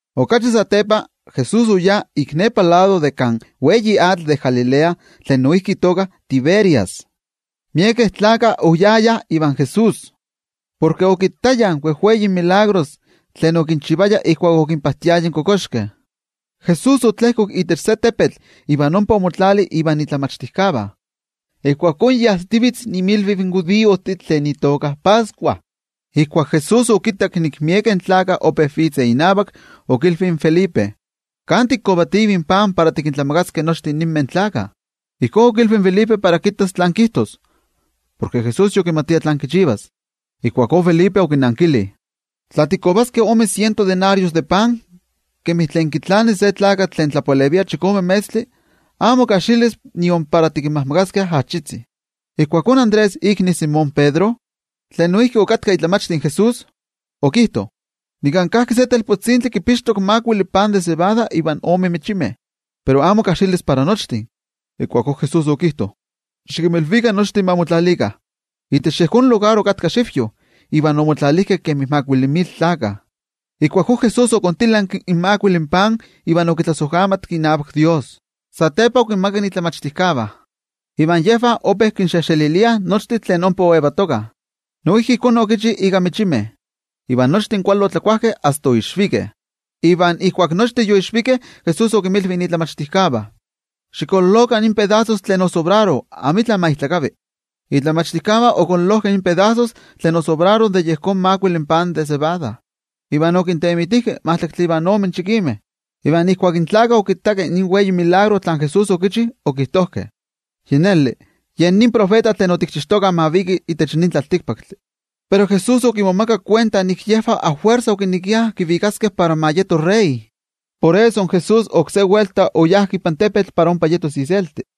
Okachi satepa, Jesús oyá ik nepa lado de kan atl tlen wei de Galilea tlen noijki itoka Tiberias. Miekeh gentejtih oyayah ivan Jesús, porke okittayah in wejwei tetzavkaneskayomeh tlen okinchivaya ijkuak okinpajtiaya in kokoxkeh. Jesús otlejkok itech se tepetl iva ompa omotlali invan momachtijkeh. Ijkuakó yi ajsitivitz inmilviv in judiojtih tlen itoka Pascua. Ijkuak Jesús okittak nik miekeh gentejtih ope vitzeh inavak, okilvi in Felipe: —¿Kan tikovativih pan para tikintlamakaskeh nochtin ninmeh gentejtih? Ijkó okilvi in Felipe para kittas tlán kijtos, porke Jesús yokimatia tlán kichivas. Ijkuakó Felipe okinankili: —Tla tikovaskeh ome siento denario de pan, kemi tlen kitlani se tlakatl tlen tlapalevia chikome metztli, amo kajxilis nion para tikinmajmakaskeh ajachitzi. Ijkuakó Andrés ikni in Simón Pedro, tlen noijki okatka momachti de Jesús, okijto: —Nika kajki se telpotzintli kipixtok makuili pan de cebada iva ome michimeh, pero amo kajxilis para nochtin. Ijkuakó Jesús okijto: —Xikinmilvikah nochtin ma motlalikah. Itech yejón lugar okatka sakayo, iva omotlalijkeh kemi makuili mil tlakah. Ijkuakó Jesús okontilanki in makuili pan iva okitlasojkamatki inavak Dios, satepa okinmakak in momachtijkeh, iva yejvah ope kinxejxeliliah nochtin tlen ompa oyejyetokah. Noijki ijkó okichi ika michimeh, iva nochtin kuali otlakuajkeh asta kan oixvikeh. Iva ijkuak nochtin yoixvikeh, Jesús okinmilvi in momachtijkeh: —Xikololokah in pedasos tlen osobraro, amitla ma ijtlakavi. In momachtijkeh okololojkeh in pedasos tlen osobraro de yejón makuili pan de cebada, iva okintemitijkeh majtlaktli ivan ome chikimeh. Iva ijkuak in gentejtih okittakeh in wei tetzavkaneskayotl tlen Jesús okichi, okijtojkeh: —Yi neli, ye nin tiotenejmachti tlen otikchixtokah ma viki itech nin tlaltikpaktli. Pero Jesús okimomakak kuenta nik yejvah afuersa okinekiah kivikaskeh para ma yeto wei tlanavati. Por eso Jesús oksé welta oyá ipan tepetl para ompa yetos iselti.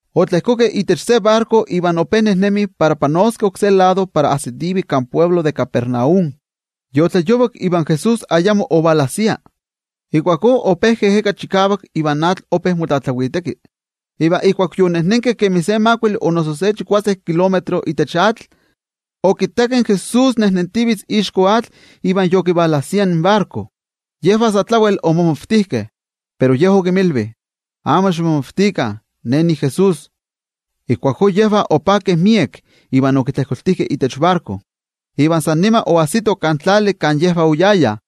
Otlejkokeh itech se barko iva ope nejnemih para panoskeh oksé lado para ajsitivih kan altepetl de Capernaum. Yotlayovak, iva Jesús ayamo yoejkoya. Ijkuakó ope ejeka chikavak ivan atl ope motlatlaviteki. Iva ijkuak yoyajkeh kemi se makuili o noso chikuase kilómetro itech atl, okittakeh in Jesús nejnentivitz ixko atl iva yokivalajsia in barko. Yejvah sa tlawel omomavtijkeh, pero Ye okinmilvi: —Amo ximomavtikah, Ne niJesús. Ijkuakó yejvah opakeh miek iva okitlejkoltijkeh itech barko. Iva san nima oajsitoh kan tlali kan yejvah oyayah.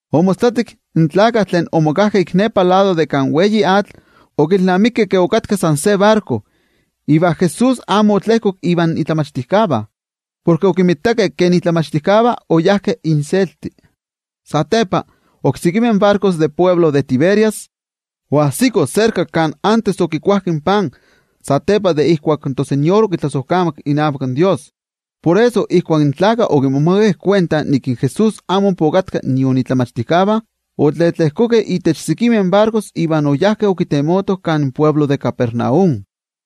Omostlatik, in gentejtih tlen omokajkeh ik nepa lado de kan atl tlen wei, okilnamikeh ke okatka san se barko, iva Jesús amo otlejkok ivan momachtijkeh, porke okinmitakeh ke in momachtijkeh oyajkeh inselti. Satepa, oksekimeh barkotih de altepetl de Tiberias, oajsikoh serka kan antes okikuajkeh in pan satepa de ijkuak in toTeko okitlasojkamatki inavak Dios. Por eso, ijkuak in gentejtih okittakeh ke Jesús amo ompa okatka nion tlen momachtijkeh, otletlejkokeh itech sekimeh barkojtih iva oyajkeh okitemotoh kan altepetl de Capernaum.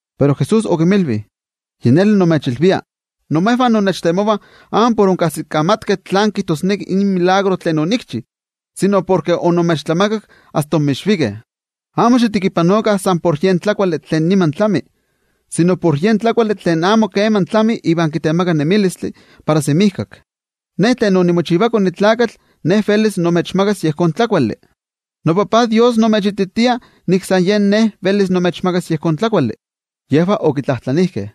Pero Jesús okinmilvi: —Yi neli nimechilvia, imejvah innechtemovah amo por onkajsikamatkeh tlán kijtosneki in tetzavkaneskayotl tlen onikchi, sino porke onimechtlamakak iva asta onmixvikeh. Amo xitekipanokah san por yen tlakuali tlen niman tlami, sino por yen tlakuali tlen amo keman tlami iva kitemaka nemilistli para semijkak. Yejón tlakuali velis imechmakas iKone in Tlakatl, porke toTajtzin Dios imechititia nik san yen iKone velis imechmakas yejón tlakuali. Yejvah okitlajtlanijkeh: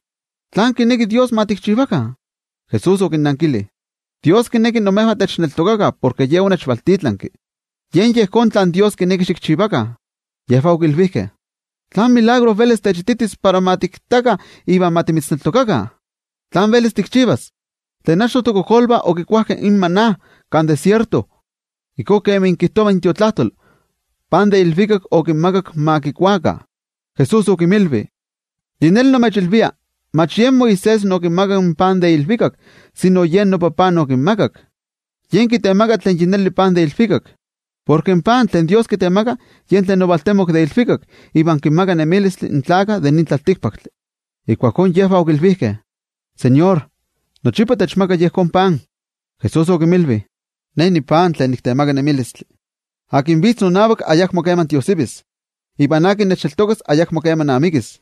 —¿Tlán kineki in Dios ma tikchivakah? Jesús okinnankili: —Dios kineki imejvah techneltokakah porke Ye onechvaltitlanki. Yen yejón tlen Dios kineki xikchivakah. Yejvah okilvijkeh: —¿Tlán tetzavkaneskayotl velis techititis para ma tikittakah iva ma timitzneltokakah? ¿Tlán velis tikchivas? Tlen achto tokojkolvah okikuajkeh in maná kan tlavaki, ijkó kemi kijtova in Tiotlajkuiloli: “Pan de ilvikak okinmakak ma kikuakah.” Jesús okinmilvi: —Yi neli nimechilvia: Mach yen Moisés okinmakak in pan de ilvikak, sino yen noTajtzi okinmakak, yen kitemaka tlen yi neli pan de ilvikak. Porke in pan tlen Dios kitemaka yen tlen ovaltemok de ilvikak iva kinmaka nemilistli in tlaltikpaktlakah. Ijkuakó yejvah okilvijkeh: —ToTeko, nochipa techmaka yejón pan. Jesús okinmilvi: —Ne nipan tlen niktemaka nemilistli. Tlen vitz nonavak ayakmo keman tiojsivis. Iva tlen nechneltokas ayakmo keman amikis.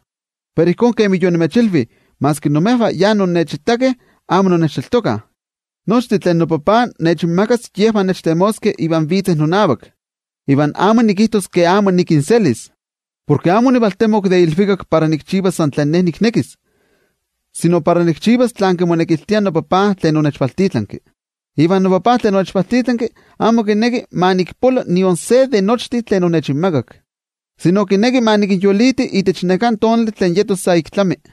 Pero ijkó kemi yonimechilvi, maski imejvah yonnechitakeh amo innechneltokah. Nochtin tlen noTajtzi nechinmakas yejvah nechtemoskeh iva vitzeh nonavak, iva amo nikijtos ke amo nikinselis. Porke amo onivaltemok de ilvikak para nikchivas san tlen Ne niknekis, sino para nikchivas tlen kimonekiltia noTajtzi tlen onechvaltitlanki. Iva noTajtzi tlen onechvaltitlanki, amo kineki ma nikpolo nion se de nochtin tlen onechinmakak, sino kineki ma nikinyoliti itech neká tonali tlen yetos sa ik tlami.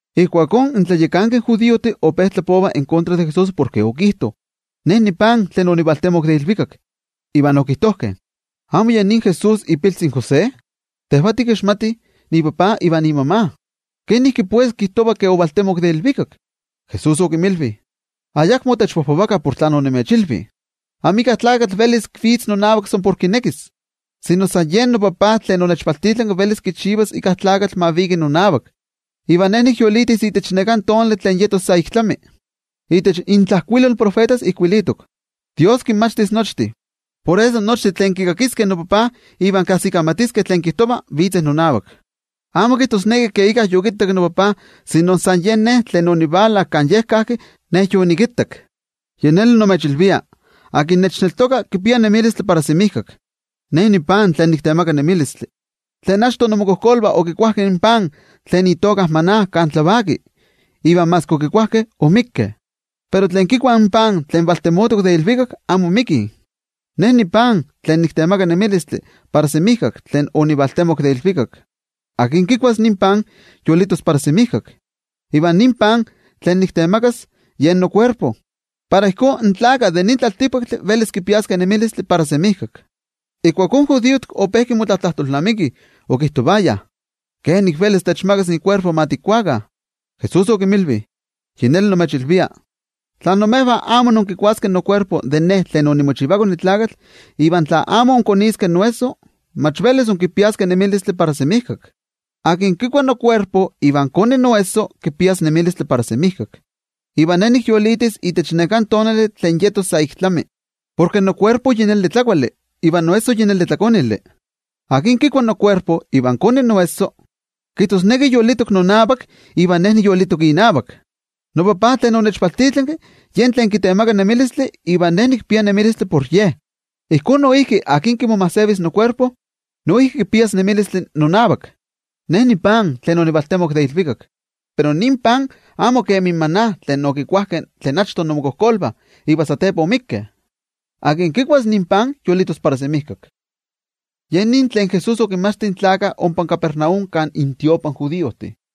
Ijkuakó in tlayakankeh judiojtih ope tlapovah en kontra de Jesús por okijto: “Ne nipan tlen onivaltemok de ilvikak.” Iva okijtojkeh: —¿Amo ye nin Jesús, ipiltzi in José? Tejvah tikixmatih ipapa iva imama. ¿Tos kenik kijtova ke ovaltemok de ilvikak? Jesús okinmilvi: —Ayakmo techpojpovakah por tlen onimechilvi. Amika tlakatl velis vitz nonavak san por kinekis, sino san yen noTajtzi tlen onechvaltitlanki velis kichivas íkka tlakatl ma viki nonavak. Iva Ne nikyolitis itech neká tonali tlen yetos sa ik tlami. Itech intlajkuilol in tiotenejmachtijkeh ijkuilitok: “Dios kinmachtis nochtin.” Por eso, nochtin tlen kikakiskeh noTajtzi iva kajsikamatiskeh tlen kijtova, vitzeh nonavak. ’Amo kijtosneki ke íkka yokittak noTajtzi. San yen tlen ovala kan Ye kajki, yen yokittak. Yi neli nimechilvia, tlen nechneltoka kipia nemilistli para semijkak. Ne nipan tlen niktemaka nemilistli. Tlen achto inmokojkolvah okikuajkeh in pan tlen itoka maná kan tlavaki, iva maski okikuajkeh, oixpolikeh. Pero tlen kikuah in pan tlen valtemotok de ilvikak, amo ixpolivih. Ne nipan tlen niktemaka nemilistli para semijkak tlen onivaltemok de ilvikak. Tlen kikuas nin pan, yolitos para semijkak. Iva nin pan tlen niktemakas, yen nokuerpo, para ijkó in tlaltikpaktlakah velis kipiaskeh nemilistli para semijkak. Ijkuakó in judiojtih ope motlatlajtolnamikih, okijtovayah: —¿Kenik velis techmakas ikuerpo ma tikuakah? Jesús okinmilvi: —Yi neli nimechilvia: Tla imejvah amo inkikuaskeh ikuerpo in iKone in Tlakatl iva tla amo inkoniskeh iesso, mach velis inkipiaskeh nemilistli para semijkak. Tlen kikua nokuerpo iva koni noesso, kipias nemilistli para semijkak, iva Ne nikyolitis itech neká tonali tlen yetos sa ik tlami. Porke nokuerpo yi neli tlakuali, iva noesso yi neli tlakonili. Tlen kikua nokuerpo iva koni noesso, kijtosneki yolitok nonavak iva Ne niyolitok inavak. NoTajtzi tlen onechvaltitlanki yen tlen kitemaka nemilistli iva Ne nikpia nemilistli por Ye. Ijkó noijki tlen kimomajsevis nokuerpo, noijki kipias nemilistli nonavak. Ne nipan tlen onivaltemok de ilvikak, pero nin pan amo kemi in maná tlen okikuajkeh tlen achto inmokojkolvah iva satepa oixpolikeh. Tlen kikuas nin pan yolitos para semijkak. Ye nin tlen Jesús okinmachti in gentejtih ompa Capernaum kan tiotlamachtijkali.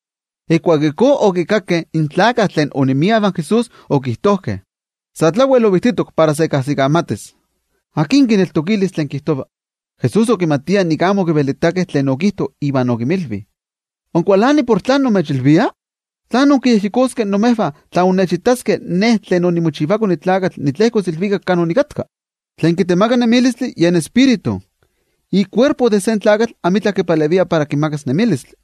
Ijkuak ijkó okikakkeh, miekeh tlen onemiah ivan Jesús, okijtojkeh: —Sa tlawel ovijtitok para se kajsikamatis. ¡Akin kineltokilis tlen kijtova! Jesús okimatia nik amo okivelitakeh tlen okijto, iva okinmilvi: —¿Inkualanih por tlen nimechilvia? ¿Tlán inkiyejyekoskeh imejvah tla inkittaskeh iKone in Tlakatl tlejkos ilvikak kan okatka? Tlen kitemaka nemilistli yen Tioijyotzintli, ikuerpo de se tlakatl amitla kipalevia para kimakas nemilistli.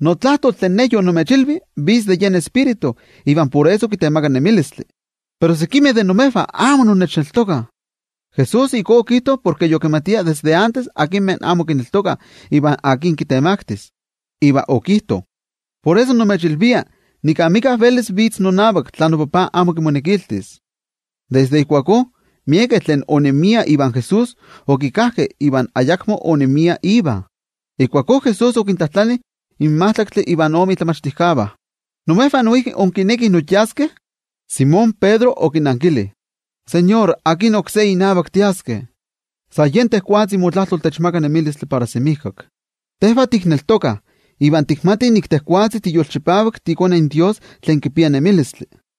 Notlajtol tlen Ne yonimechilvi vitz de yen Tioijyotzintli iva por eso kitemaka nemilistli. Pero sekimeh de imejvah amo innechneltokah. Jesús ijkó okijto porke yokimatia desde antes akinmeh amo kineltokah iva akin kitemaktis. Iva okijto: —Por eso, nimechilvia nik amika velis vitz nonavak, tla noTajtzi amo kimonekiltis. Desde ijkuakó, miekeh tlen onemiah ivan Jesús okikajkeh iva ayakmo onemiah Iva. Ijkuakó Jesús okintlajtlani in majtlaktli ivan ome momachtijkeh: —¿Imejvah noijki inkinekih inyaskeh? Simón Pedro okinankili: —NoTeko, ¿akin oksé inavak tiaskeh? San yen motlajtol kitemaka nemilistli para semijkak. Tejvah tikneltokah iva tikmatih nik tejwatzi tiyolchipavak tiiKone in Dios tlen yolitok.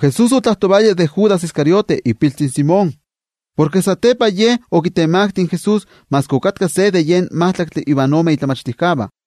Jesús otlajtovaya de Judas Iscariote ipiltzi in Simón, porke satepa ye okitemakti in Jesús maski okatka se de yejvah tlen majtlaktli ivan ome momachtijkeh.